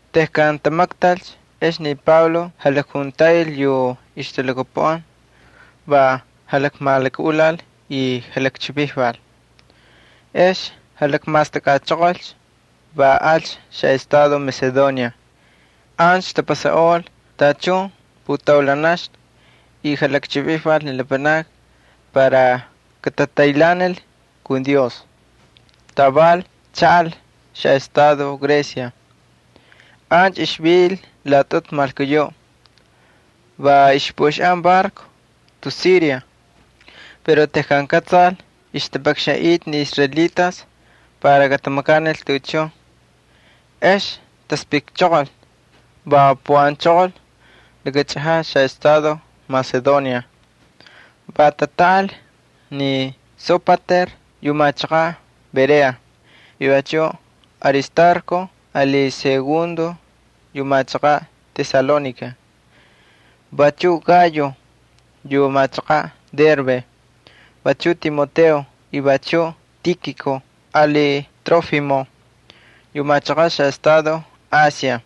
Tejkan tamaktalcha ex ni Pablo jalakjuntaꞌil yu ixtalhakapuꞌan, va jalakmalakaꞌulal y jalakchivijval. Ex lakmastakꞌachoqolcha, va alcha xaꞌestado Macedonia. Ancha tapasaꞌol tachun putaulanaxna y jalakchivijval ni lapanakni para katataylhaanil kun Dios. Taval chaꞌal xaꞌestado Grecia. Ancha ixvil laꞌatꞌutu malkuyuꞌ. Va ixpuꞌuxaꞌan barco tus Siria pero tejkan kꞌatsal ixtapakxanꞌita ni israelitas para katamakanil tuꞌuchun, ex taspꞌikchoqolcha va puꞌanchoqol laka chꞌajaꞌ xaꞌestado Macedonia. Va tatꞌaꞌal ni Sópater yu machaqaꞌ Berea, y vachuꞌ Aristarco ali Segundo yu machaqan Tesalónica, vachuꞌ Gayo yu machaqaꞌ Derbe vachuꞌ Timoteo y vachuꞌ Tíkiko ali Trófimo yu machaqan xaꞌestado Asia.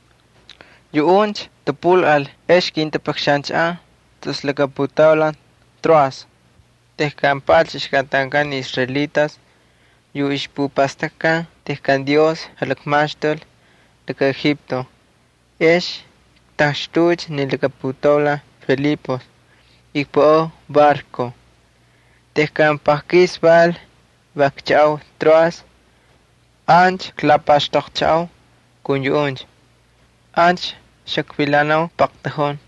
Yuꞌuncha tapꞌulꞌal ex kintapakxanchaꞌan tus laka putaulan Troas. Tejkan paꞌalcha ixkꞌatankꞌan ni israelitas tejkan taꞌuy pan sin levadura, ex ktaxtuucha ni laka putaulan Filipos, y kpuꞌau barco. Tejkan paqkis val va kchaꞌau Troas ancha klapaxtoqchaꞌau kun yuꞌuncha. Ancha xakvilanau paqtujun.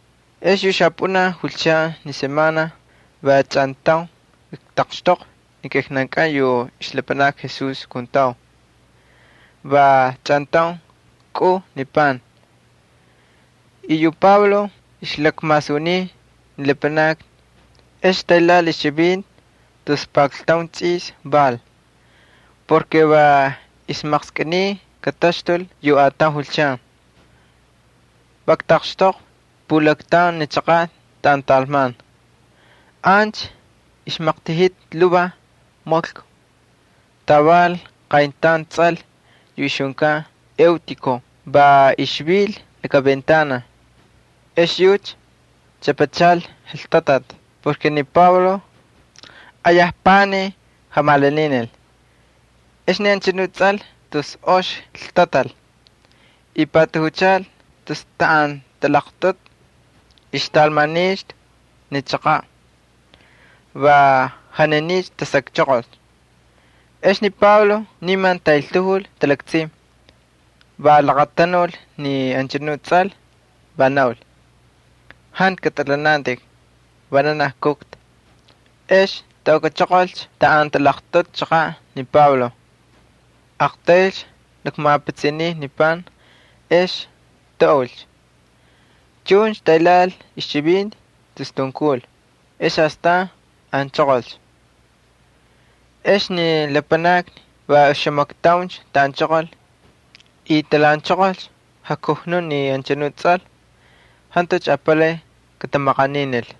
Ex yu xapꞌunaj julchan ni semana va chꞌantaun ktaqxtoqvi ni kijnankꞌan yu ixlapanakni Jesús kuntau, va chꞌantaun kꞌuu ni pan. Yu Pablo ixlakmasuniy ni lapanakni, ex taylhaꞌal ixchivinti tus pakltaun tsꞌis val porke va ixmaqskꞌiniy kataxtul yu ataun julchan. Va ktaqxtoqvi yu pulaktaun ni chaqaꞌ taꞌan talman. Ancha ixmaqtajita lhuvaj maklku. Taval qayntaun tsꞌal yu ixjunkan Eutiko va ixvil laka ventana. Ex yucha chꞌapachal ltatati porke ni Pablo ayaj panij jamalaninil. Ex ni anchanu tsꞌal tus ox ltatal y patajuchal tus taꞌan talaqtꞌutu ixtalmanixtu ni chaqaꞌ, va janinicha tasakchoqol. Ex ni Pablo niman taꞌeltajul talaktsin, va laqatanul ni anchanu tsꞌal, va naul: —Jantu katꞌalhanantꞌik. Vananaj kujta. Ex taukꞌachoqolcha taꞌan talaqtꞌutu chaqaꞌ ni Pablo, aqtaylcha lakmapitsiniy ni pan, ex taꞌulcha. Chuncha taylhaꞌal ixchivinti tus tunkul ex astan anchoqolcha. Ex ni lapanakni va oxamaktauncha taꞌanchoqol y talhaꞌanchoqol jakujnuꞌ ni anchanuꞌ tsꞌal. Jantucha apalay katamaqaninil.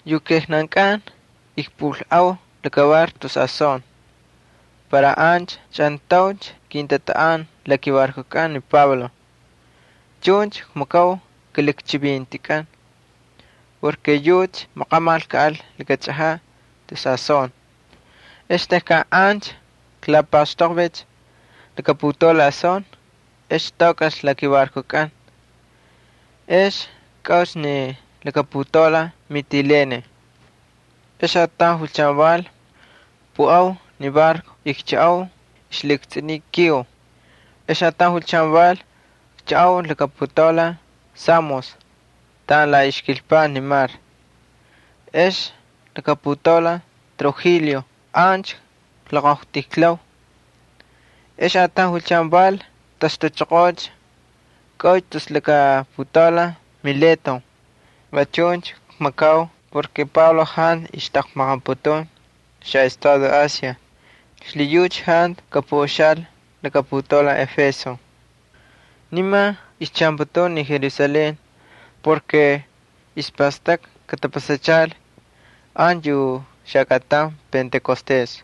Yu kijnankꞌan ikpꞌulꞌau laka barco tus Asón para ancha chꞌantauncha kintatꞌaꞌan la kibarcokꞌan ni Pablo. Chuncha kmakau kilakchivintikꞌan porke yucha maqamal kaꞌal laka chꞌajaꞌ tus Asón. Ex tejkan ancha klapaxtoqvicha laka putaulan Asón ex taukꞌalcha la kibarcokꞌan. Ex kꞌaucha ni putaulan Mitilene. Ex ataun julchan val, kpuꞌau ni barco y kchaꞌau ixlhiꞌukstsꞌuniy Quío. Ex ataun julchan val kchaꞌau laka putaulan Samos taꞌan la ixkilpaꞌ ni mar. Ex laka putaulan Trigilio ancha kloqojtijlau. Ex ataun julchan val taxtuchoqoocha, kꞌaucha tus laka putaulan Mileto. Va chuncha kmakau porke Pablo jantu ixtaqmaqaputun xaꞌestado Asia xlhiyucha jantu kapuꞌuxaꞌal laka putaulan Éfeso. Niman ixchaꞌanputun ni Jerusalén porke ixpastakꞌa katapasachal ancha yu xakꞌatan Pentecostes.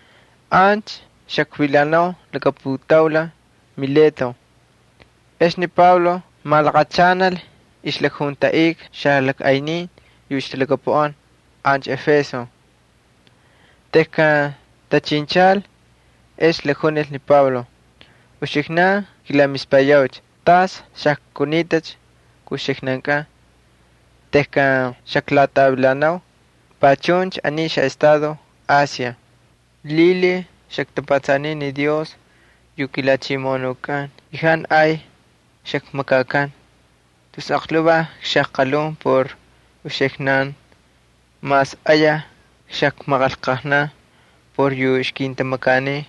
Ancha xakvilanau laka putaulan Mileto, ex ni Pablo malaqachanal ixlakjuntaꞌika xalajꞌaynin yu ixtalhakapuꞌan ancha Éfeso. Tejkan tachinchalcha ex lakjunil ni Pablo: —Uxiknan kilamispayaucha tas xajkunitacha kun uxiknan tejkan xaklatꞌavilanau panchuncha aniy xaꞌestado Asia. Lhilhiy xaktapatsaniy ni Dios yu kiJalhachimoꞌonukꞌan y jantu ay xakmakakan. Tus aqlhuvaj xajqalhun por uxiknan mas ayaj xakmaqanlqajnan por yu ixkintamakaniy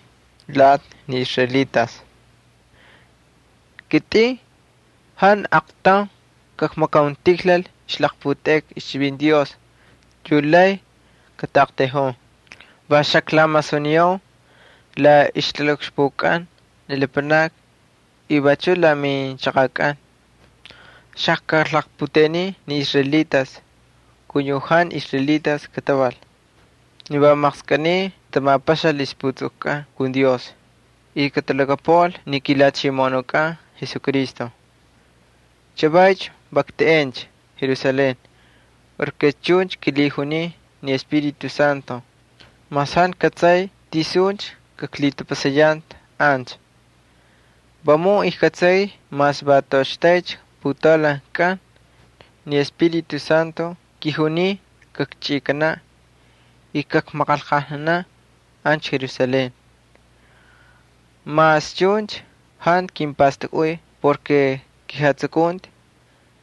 lati ni israelitas. Kitꞌin jantu aqtaun kakmakauntijlal ixlaqputeꞌeka ixchivinti Dios yu lay kataꞌaqtayjun. Va xaklamasuniyau la ixlakaꞌukxpukꞌan ni lapanakni y vachuꞌ la minchaqakꞌan. Xajkalaqputeꞌeniy ni israelitas ali yu jantu israelitas kataval, ni va maqskꞌiniy katamapaxal ixjatapastakꞌatkꞌan kun Dios y katalhakapuꞌal ni kiJalhachimoꞌonukꞌan Jesucristo. Chavaycha va kteꞌencha Jerusalén porke chuncha kilhijuniy ni Espíritu Santo mas jantu kꞌatsay tisuncha kaklhitapasayanta ancha. Vamun ijkꞌatsay mas va toꞌoxtaycha putaulan kꞌan, ni Espíritu Santo kijuniy kakchꞌikanaꞌ y kakmaqanlqajnanaꞌ ancha Jerusalén. Mas chuncha jantu kimpastakꞌuy porke kijatsukunti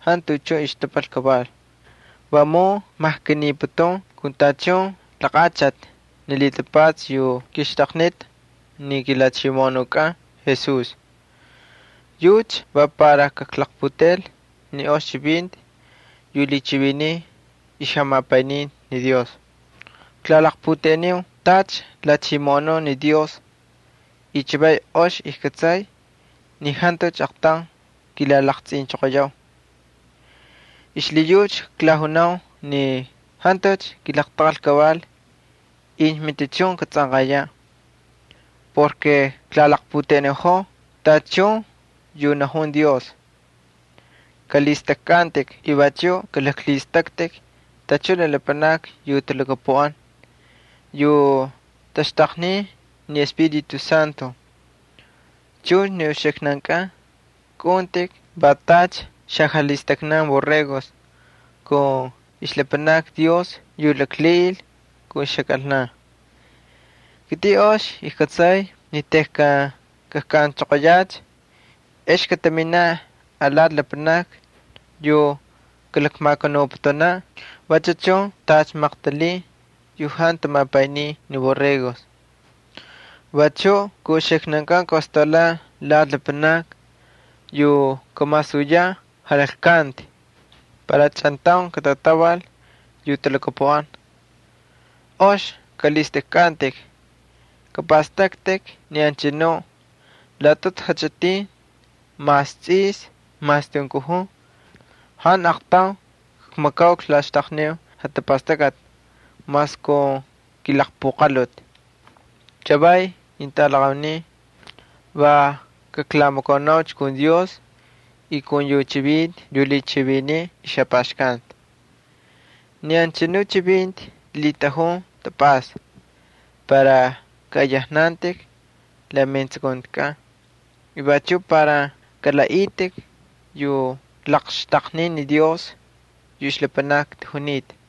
jantu tuꞌuchun ixtapal kaval. Vamun kmajkaniputun kun tachun laqaꞌachati ni lhitapatsa yu kixtaqnita ni kiJalhachimoꞌonukꞌan Jesús. Yucha va para kaklaqputeꞌel ni ox chivinti yu lhichiviniy ixjamapayninti ni Dios. ’Klalaqputeꞌeniu tacha lhachimoꞌonun ni Dios y chavay ox ijkꞌatsay ni jantucha aqtaun kilalaqtsꞌinchoqoyau. Xlhiyucha klajunau ni jantucha kilaqtaqal kaval incha matichun katsꞌanqayaꞌ porke klalaqputeꞌeniꞌojoo tachun yu najun Dios. Kꞌalhistꞌajkꞌantꞌik y vachuꞌ kalaklhistꞌaktꞌik tachun ni lapanakni yu talhakapuꞌan yu taxtaqnin ni Espíritu Santo. Chuncha ni uxiknankꞌan kꞌaꞌuntꞌik va tacha xajalhistaknan borregos kun ixlapanakni Dios yu laklhiꞌil kun ixjakꞌalna. Kitꞌin ox kꞌatsay ni tejkan kajkꞌanchoqoyacha ex kataminaꞌ alati lapanakni yu kalakmakanuputunaꞌ vachu chun tacha maqtalin yu jantu tamapayniy ni borregos. Vachuꞌ kun uxiknan kataꞌostaulaꞌ lati lapanakni yu kamasuyaꞌ jalaklkanti para chꞌantaun katatꞌaval yu talhakapuꞌan. Ox kꞌalhistꞌajkꞌantꞌik. Kapꞌastꞌaktꞌik ni anchanu laꞌatꞌutu jachꞌitin mas tsꞌis mas tunkuj jantu aqtaun kmakaul klaxtaqniu jatapastakꞌati mas kun kilaqpuqalhuti. ’Chavaycha, ketꞌalaqaunin, va kaklamakaunaucha kun Dios ali yu chivinti yu lhichiviniy ixjapaxkanti. Ni anchanu chivinti lhitꞌajun tapꞌasta para kaꞌayajnantꞌik la metsukuntikꞌan y vachuꞌ para kalaꞌaꞌitꞌik yu laqxtaqniy Dios yu ixlapanakni tajunita.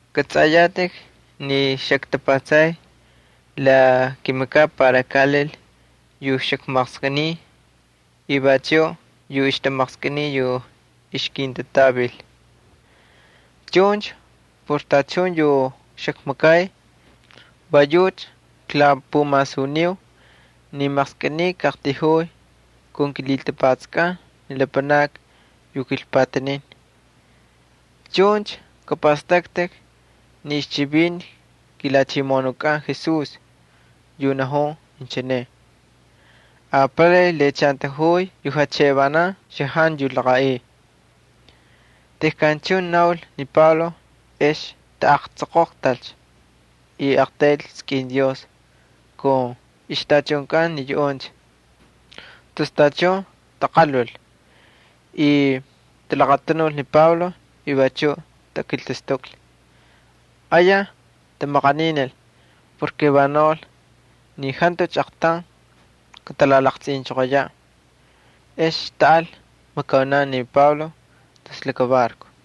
Kꞌatsꞌayatꞌik ni xaktapatsay la kimakaꞌ para kaꞌalil yu xakmaqskꞌiniy y vachuꞌ yu ixtamaqskꞌiniy yu ixkintatꞌavil. Chuncha por tachun yu xakmakay va yucha klapumasuniu ni maqskꞌiniy kaꞌaqtayjuu kun kilhitapatskꞌan ni lapanakni yu kilpatanin. Chuncha kꞌapꞌastꞌaktꞌik ni ixchivinti kiJalhachimoꞌonukꞌan Jesús yu najun inchine: “Apalay lhiꞌachantajuy yu xtaꞌa xajantu yu laqaꞌiy.” Tejkan chuncha naul ni Pablo ex tatsoqoqtalcha y aqtayl skꞌin Dios kun ixtachunkꞌan ni yuꞌuncha. Tus tachun taqalhul, y talaqatanul ni Pablo, y vachuꞌ takiltastuklhi. Ayaj tamaqaninil porke va naul ni jantucha aqtaun katalalaqtsꞌinaꞌ. Ex taꞌal makaunan ni Pablo tus laka barco.